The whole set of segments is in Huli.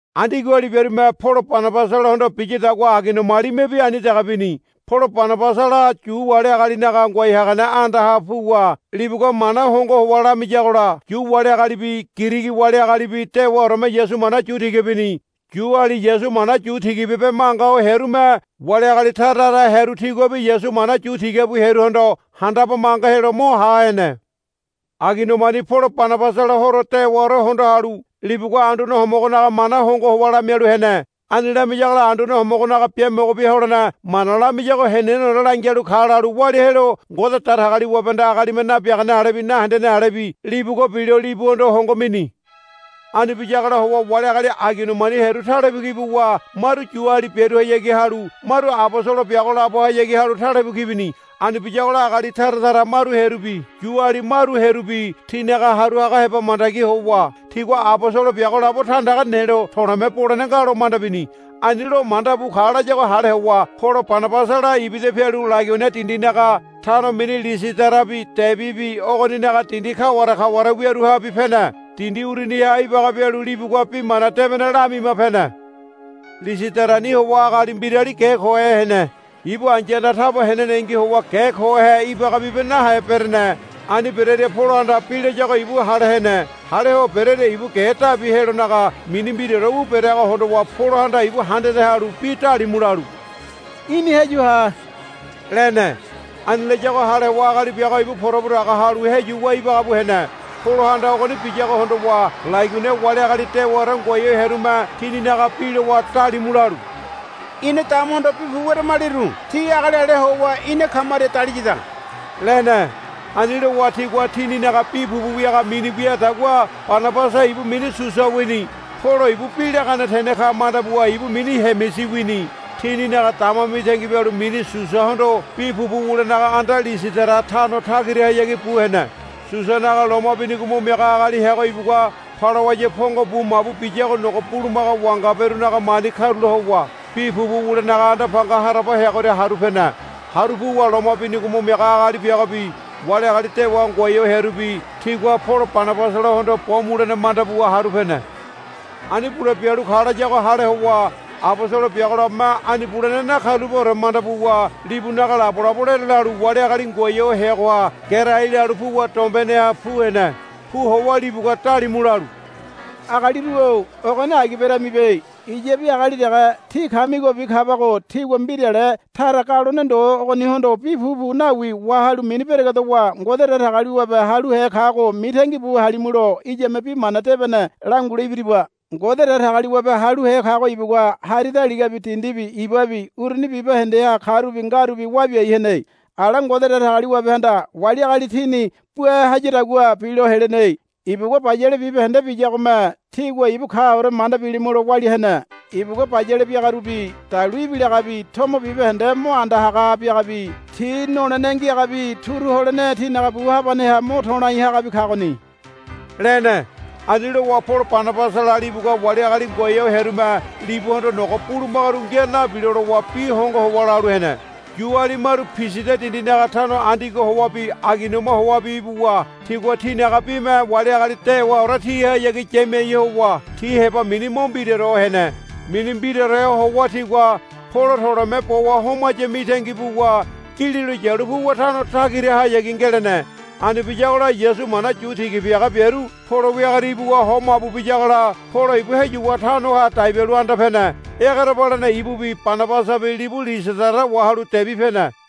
Andiogoali biarume Polo Banabasalahondo biyadagua Aigoniamalimebi ani dege bini. Polo Banabasala Yu wali agalinaga ngoai hagane andaha puwa libugua mana hongo howa lamiyagola Yu wali agalibi Girigi wali agalibi dewaoreme Yasu mana yu tiga bini. Yuali Yasu mana yu tiga bibe manga ho hearume wali agali tara tara hearu tiguabi Yasu mana yu tiga bu hearuhondo handabe manga helo mo ha hene. Aigoniamani Polo Banabasala horo dewaore hondo halu libugua Anduane Homogonaga mana hongo howa lamialu hene. Ani lamiyagola Anduane Homogonaga biamogo bia holene mana lamiyago heneneore langialu ka lalu walia helo Ngode Datagaliwabehanda agalime nabiagane alebi nahendene alebi libugua bilo libuhondo hongo mini. Ani biyagola howa wali agali Aigoniamani hearu talebu ki buwa maru Yuali biaruhayagi halu maru abosolo biago labohayagi halu talebu ki bini. Ani biyagola agali tara tara maru hearubi Yuali maru hearubi tinaga haru haga heba mandagi howa tigua abosolo biago labo tandaga nelo to̱le̱me bolene nga lo manda bini. Ani lo manda bu ka layago hale howa Polo Banabasala ibida pialu Laigonia dindinaga tano mini Lisidarabi Debibi ogoninaga dindi kaware kaware wiaruhabi pene. Dindi uruniha ibaga bialu libugua Bi Mana Debene lamima pene. Lisidarani howa agali mbirali ge kohe hene. Ibu ai̱yahanda taba henenengi howa ge kohe ibaga bibe nahe berene. Ani berearia Polohanda bi layago ibu hale hene. Hale ho berearia ibu ge dabi helonaga mini mbiraore wu bereago hondowa Polohanda ibu handade halu bi dalimu lalu, Í̠ni heyu ha, lene. Ani layago hale howa agali biago ibu porabu daga halu heyuwa ibaga bu hene. Polohanda ogoni biyago hondowa Laigonia wali agali dewaore ngoai ho hearume tininaga bi lowa dalimu lalu, Ina damahondo bi pupu weramaliru ti agali ale howa ina kamaria daliyada, lene. Ani lowa tigua tininaga bi pupu wiaga mini wiadagua Banabasa ibu mini Susa wini. Polo ibu bi lagane tene ka manda buwa ibu mini Hemisi wini. Tininaga dama mitangi bialu mini Susahondo bi pupu wulenaga anda Lisidara tano tagirahayagi bu hene. Susanaga loma binigo mo miaga agali heago ibugua palawaya pongo bu mabu biyago nogo bulumaga wangaberunaga mani karula howa bi pupu wulenaga anda panga haraba heagoria haru pene. Haru puwa loma binigo mo miaga agali biagobi wali agali dewa ngoai ho hearubi tigua Polo Banabasalahondo bo mulene manda buwa haru pene. Ani bule bialu ka layago hale howa abosolo biago labome ani bulene nakarulapeore manda buwa libunaga labolabo lerelalu wali agali ngoai ho heagoha gerai lalu puwa dombeneha pu hene. Pu howa libugua dalimu lalu, Agaliru-o ogoni agi beramibe. Iyabi agali dege tí kamigobi kabago tígua mbirale tara galone ndo ogonihondo bi pupu nawi wahalu mini beregedowa Ngode Datagaliwabe haluhe kago mitangi bu halimulo iyame Bi Mana Debene langule ibiriba. Ngode Datagaliwabe haluhe kago ibugua hari daligabi dindibi ibabi uruni bibahendeha karubi ngarubi wa biai hene. Ala Ngode Datagaliwabehanda wali agali tini bua hayadagua bilo helene. Ibugua bayale bibahende biyagome tígua ibu kaore manda bilimulo walia hene. Ibugua bayale biaga urubi dalu ibilagabi tomo bibahende mo anda haga biagabi tí nolene ngiagabi turu holene tínaga bu habaneha mo to̱lai hagabi kagoni, lene. Ani lowa Polo Banabasala libugua wali agali ngoai ho hearume libuhondo nogo bulumagaru ngia nabilo lowa bi hongo howa lalu hene. Yuali maru Pisidia dindinaga tano Andiogo howabi Aigoniama howabi ibuwa tigua tinaga bime wali agali dewaore tihayagi yamiai howa ti heba mini mo mbiraore hene. Mini mbiraore howa tigua Polo to̱le̱me bowa homaya mitangi buwa gililo yalu puwa tano tagirahayagi ngelene. Ani biyagola Yasu mana yu tiga biaga biaru Polo wiagoria ibuwa ho mabu biyagola Polo ibu heyuwa tanoha dai bialu anda pene. Egerebalene ibubi Banabasabi libu Lisidara wahalu Debi pene.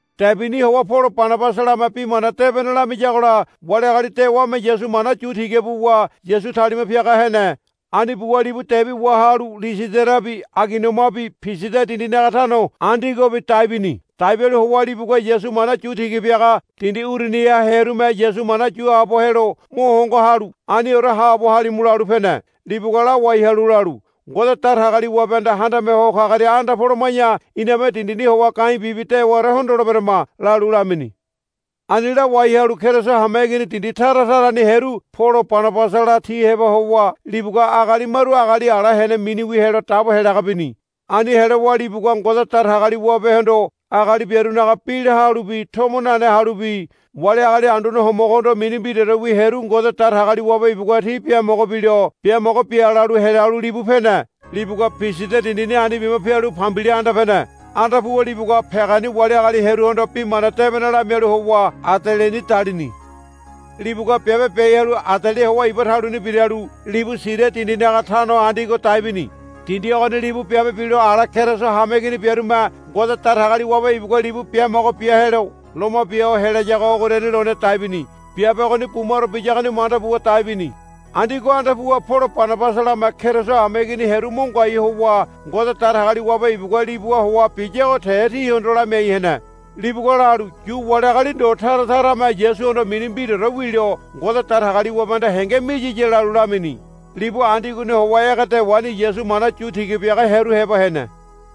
Debini howa Polo Banabasalame Bi Mana Debene lamiyagola wali agali dewame Yasu mana yu tiga buwa Yasu talima piaga hene. Ani buwa libu Debi wahalu Lisidarabi Aigoniamabi Pisidia dindinaga tano Andiogobi dai bini. Dai bialu howa libugua Yasu mana yu tiga biaga dindi uruniha hearume Yasu mana yu haabo helo mo hongo halu, Aniore haabo halimu, lalu pene. Libugua lawai halu lalu, Ngode Datagaliwabehanda Handame Ho Kagoria anda poloma̱ya iname dindini howa ga̱i̱ bibi dewaore hondoleberama, lalu lamini. Ani lawai halu Keriso hameigini dindi tara tarani hearu Polo Banabasala ti heba howa libugua agali maru agali ala hene miniwi helo dabo helaga bini. Ani helowa libugua Ngode Datagaliwabehondo agali biarunaga bi la halubi tomo nane halubi wali agali Anduane Homogohondo mini mbiraorewi hearu Ngode Datagaliwabe ibugua ti biamogo bilo, Biamogo bia, lalu helalu libu pene. Libugua Pisidia dindini ani bima pialu Pambilia anda pene. Anda puwa libugua Pegani wali agali hearuhondo Bi Mana Debene lamialu howa Adeliani dalini. Libugua biabe biai halu Adelia howa iba taluni biralu libu Siria dindinaga tano Andiogo dai bini. Dindi ogoni libu biabe bilo ala Keriso hameigini biarume Ngode Datagaliwabe ibugua libu biamogo bia helo loma bia ho helayagoha ogoriani lone dai bini. Biabe ogoni bumaro biyagoni manda buwa dai bini. Andiogo anda puwa Polo Banabasalame Keriso hameigini hearu mo ngoai howa Ngode Datagaliwabe ibugua libuha howa biyago te tihondo lamiai hene. Libugua lalu, Yu wali agali ndo tara tarame Yasuhondo mini mbiraore wilo Ngode Datagaliwabehanda henge miyiya, lalu lamini. Libu Andiogoni howa ege dewani Yasu mana yu tiga biaga hearu heba hene.